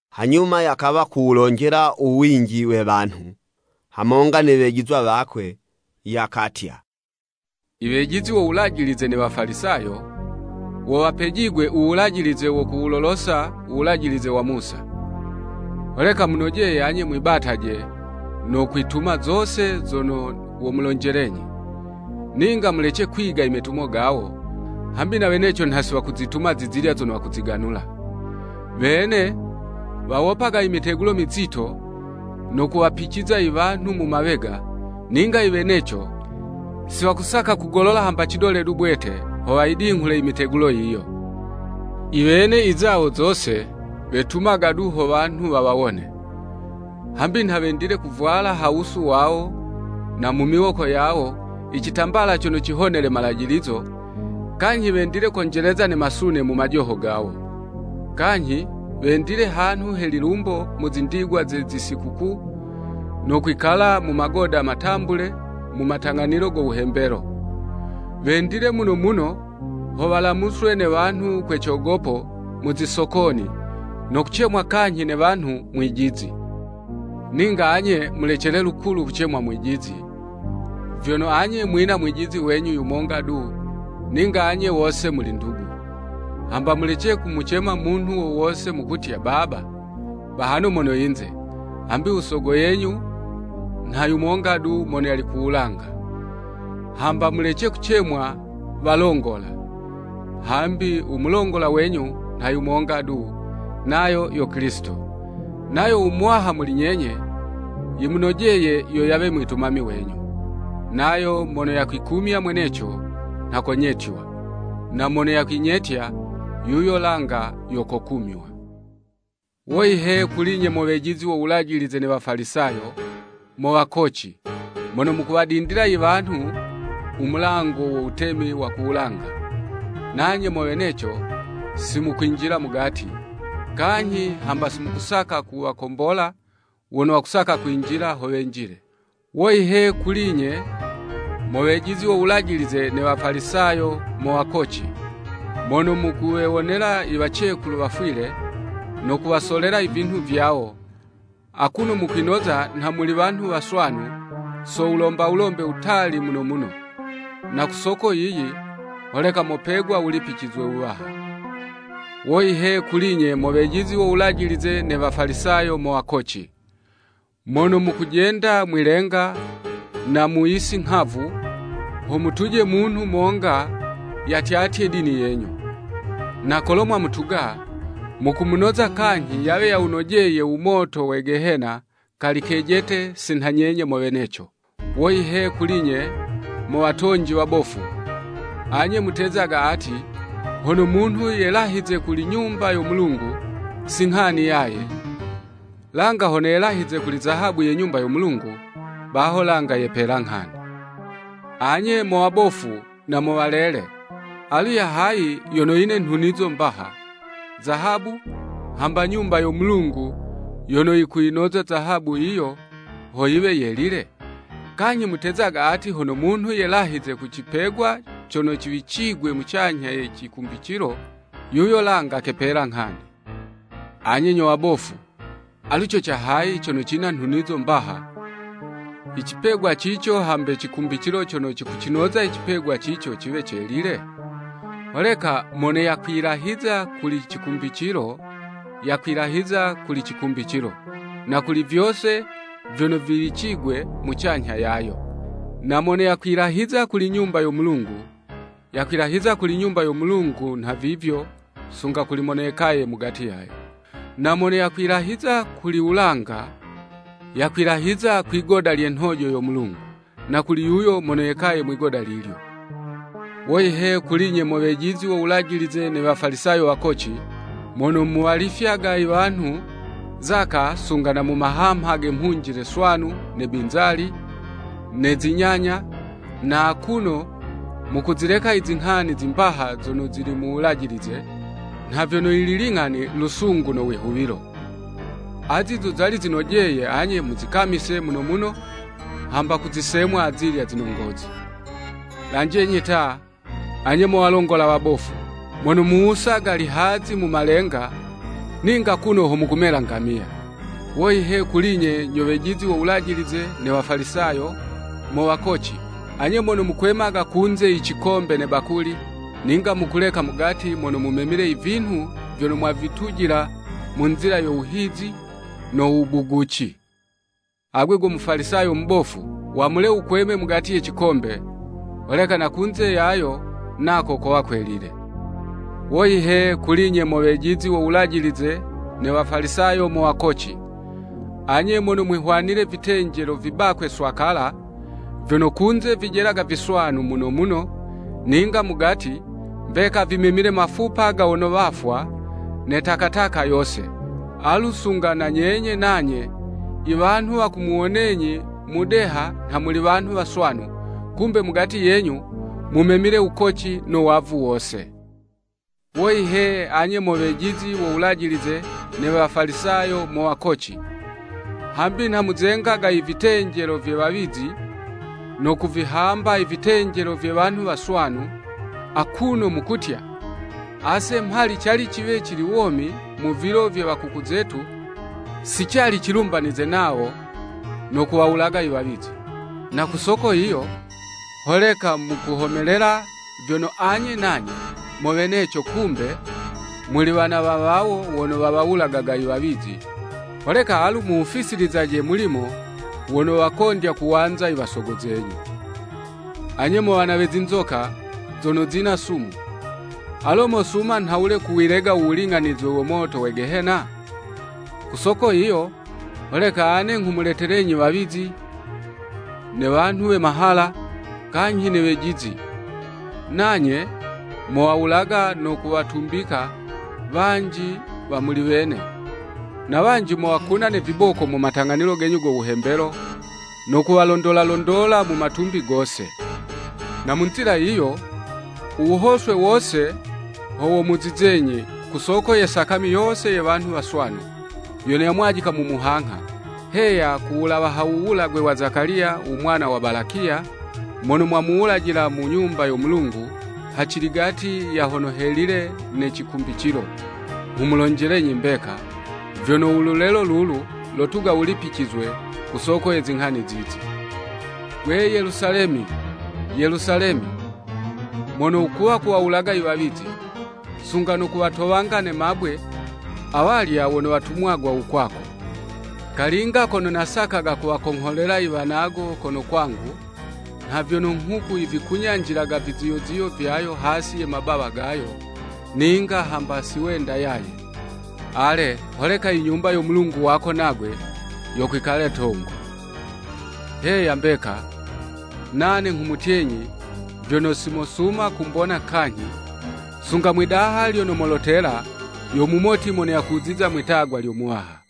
Hanyuma yakawa kuwulonjela u winji we wanhu, hamonga ne wejizwa wakwe, yakatya, “Iwejizi wo Wulajilize ne Wafalisayo, wo wapejigwe u wulajilize wo kuwulolosa u Wulajilize wa Musa. Holeka munojeye anye mwibataje, no kwituma zose zono womulonjelenyi. Ninga mulece kwiga imetumo gawo, hambi na weneco nha si wakuzituma zizilya zono wakuziganula. Wene wawopaga imitegulo mizito, no kuwapiciza iwanhu mu mawega, ninga iweneco si wakusaka kugolola hamba cidole du bwete, ho wayidinghule imitegulo yiyo. Iwene izawo zose, wetumaga du ho wanhu wawawone. Hambi nha wendile kuvwala ha wusu wawo na mu miwoko yawo icitambala cono cihonele malajilizo, kanyhi wendile konjeleza ne masune mu majoho gawo. Kanyhi, wendile hanhu he lilumbo mu zindigwa ze zisikukuu, no kwikala mu magoda matambule mu matang'anilo go wuhembelo. Wendile muno muno ho walamuswe ne wanhu kwe cogopo mu zisokoni, no kucemwa kanyhi ne wanhu, ‘Mwijizi.’ Ninga anye, mulecele lukulu kucemwa ‘Mwijizi,’ vyono anye mwina mwijizi wenyu yumonga du, ninga anye wose muli ndugu. Hamba mulece kumucema munhu wo wose mukumutya, ‘Baba,’ bahano mono yinze, hambi u sogo yenyu, nha yumonga du mono yali ku wulanga. Hamba mulece kucemwa, ‘Walongola.’ hambi u mulongola wenyu nha yumonga du, nayo yo Kilisito. Nayo u muwaha muli nyenye, yimumojeye yo yawe mwitumami wenyu. Nayo mono yakwikumya mweneco, nha konyetywa, na mono yakwinyetya, yuyo langa yo kokumywa.” “Woyi he kuli'nye mo wejizi wo Wulajilize ne Wafalisayo, mo wakoci! Mono mukuwadindila iwanhu u mulango wo Wutemi wa ku wulanga. Nanye mo weneco si mukwinjila mugati, kanyhi hamba si mukusaka kuwakombola wono wakusaka kwinjila ho wenjile. [ “Woyi he kuli'nye mo wejizi wo Wulajilize ne Wafalisayo mo wakoci! Mono mukuwewonela iwacekulu wafwile, no kuwasolela ivinhu vyawo, akuno mukwinoza nha muli wanhu waswanu, so wulomba wulombe wutali muno muno. Na ku soko yiyi, holeka mopegwa wulipicizwe wuwaha.] “Woyi he kuli'nye mo wejizi wo Wulajilize ne Wafalisayo mo wakoci! Mono mukujenda mwi'lenga na mu yisi nghavu ho mutuje munhu monga yatyatye dini yenyu. Na kolo mwamutuga, mukumunoza kanyhi yawe yawunojeye u moto we Gehena kali kejete si nha nyenye mo weneco. “Woyi he kuli'nye, mo watonji wabofu! Anye mutezaga ati hono munhu yelahize kuli Nyumba yo Mulungu, si nghani yaye, langa hono yelahize kuli zahabu ye Nyumba yo Mulungu, baho langa yepela nghani. Anye mo wabofu, na mo walele! Alu ya hayi yono yine nhunizo mbaha, zahabu, hamba Nyumba yo Mulungu yono yikuyinoza zahabu yiyo ho yiwe yelile? Kanyhi mutezaga ati hono munhu yelahize ku cipegwa cono ciwicigwe mucanyha ye cikumbicilo, yuyo langa kepela nghani. Anye nyo wabofu, alu co ca hayi cono cina nhunizo mbaha, i cipegwa cico hambe cikumbicilo cono cikucinoza i cipegwa cico ciwe celile? Holeka mono yakwilahiza kuli cikumbicilo, yakwilahiza kuli cikumbicilo, na kuli vyose vyono viwicigwe mucanyha yayo. Na mono yakwilahiza kuli Nyumba yo Mulungu, yakwilahiza kuli Nyumba yo Mulungu nha vivyo sunga kuli mono yekaye mugati yayo. Na mono yakwilahiza kuli wulanga, yakwilahiza kuli ligoda lye nhojo lyo Mulungu, na kuli yuyo mono yekaye mwigoda lilyo. Woyi he kuli'nye mo wejizi wo Wulajilize ne Wafalisayo mo wakoci! Mono muwalifyaga iwanhu, zaka sunga na mu mahamha ge mhunjile swanu, ne binzali, ne zi nyanya, na akuno mukuzileka izinghani zimbaha zono zili mu Wulajilize, nha vyono iling'ani, lusungu no wihuwilo. Azi zo zali zinojeye anye muzikamise muno muno, hamba kuzisemwa azilya zinongozi. Lanjenyi ta, anye mo walongola wabofu! Mono muwusaga lihazi mu malenga, ninga kuno ho mukumela ngamiya! “Woyi he kuli'nye nyo wejizi wo Wulajilize ne Wafalisayo, mo wakoci! Anye mono mukwemaga kunze i cikombe ne bakuli, ninga mukuleka mugati mono mumemile ivinhu vyono mwavitujila mu nzila yo wuhizi no wubuguci. Agwe go Mufalisayo mubofu! Wamule wukweme mugati ye cikombe, holeka na kunze yayo nako kowa kwelile. “Woyi he, kuli'nye mo wejizi wo Wulajilize ne Wafalisayo mo wakoci! Anye, mono mwihwanile vitenjelo vibakwe swakala, vyono kunze vijelaga viswanu muno muno, ninga mugati, mbeka vimemile mafupa ga wono wafwa, ne takataka yose. Alu sunga na nyenye nanye iwanhu wakumuwonenyi mudeha nha muli wanhu waswanu, kumbe mugati yenyu, mumemile wukoci no wavu wose.” “Woyi he, anye mo wejizi wo Wulajilize ne Wafalisayo, mo wakoci! Hambi nha muzengaga ivitenjelo vye wawizi, no kuvihamba ivitenjelo vye wanhu waswanu. Akuno mukutya, ‘Ase mhali cali ciwe cili womi mu vilo vye wakuku zetu, si cali cilumbanize nawo no kuwawulaga iwawizi.’ Na ku soko yiyo, holeka mukuhomelela vyono anye nanye mo weneco kumbe, muli wana wa wawo wono wawawulagaga i wawizi, holeka alu muwufisilizaje mulimo wono wakondya kuwanza i wasogo zenyu! Anye mo wana we zinzoka, zono zina sumu! Alo mosuma nhawule kuwilega u wuling'anizwe wo moto we Gehena? Ku soko yiyo holeka ane nghumuletelenyi wawizi, ne wanhu we mahala, kanyhi ne wejizi, nanye mowawulaga no kuwatumbika wanji wa muli wene, na wanji mowakuna ne viboko mu matang'anilo genyu go wuhembelo, no kuwalondola londola mu matumbi gose. Na mu nzila yiyo, u wuhoswe wose ho womuzizenyi, ku soko ye sakami yose ye wanhu waswanu, yono yamwajika mu muhangha. Heya ku wulawa ha wuwulagwe wa Zekaliya, u mwana wa Balakiya mono mwamuwulajila mu Nyumba yo Mulungu haciligati ya Hono Helile ne cikumbicilo. Nghumulonjelenyi mbeka, vyono u lulelo lulu lotuga wulipicizwe ku soko ye zinghani zizi.” “Gwe Yelusalemi, Yelusalemi, mono wukuwa kuwawulaga iwawizi, sunga no kuwatowanga ne mabwe awalya wono watumwagwa u kwako. Kalinga kono nasakaga kuwakongholela iwanago kono kwangu, nha vyono nghuku yivikunyanjililaga viziyoziyo vyayo hasi ye mabawa gayo, ninga hamba si wenda yaye. Ale, holeka i Nyumba yo Mulungu wako nagwe yokwikala 'tongo. Heya, mbeka, nane nghumutyenyi vyono, si mosuma kumbona kanyhi, sunga mwi'daha lyono molotela, ‘Yo mumoti mono yakuziza Mwi'tagwa lyo Muwaha.'"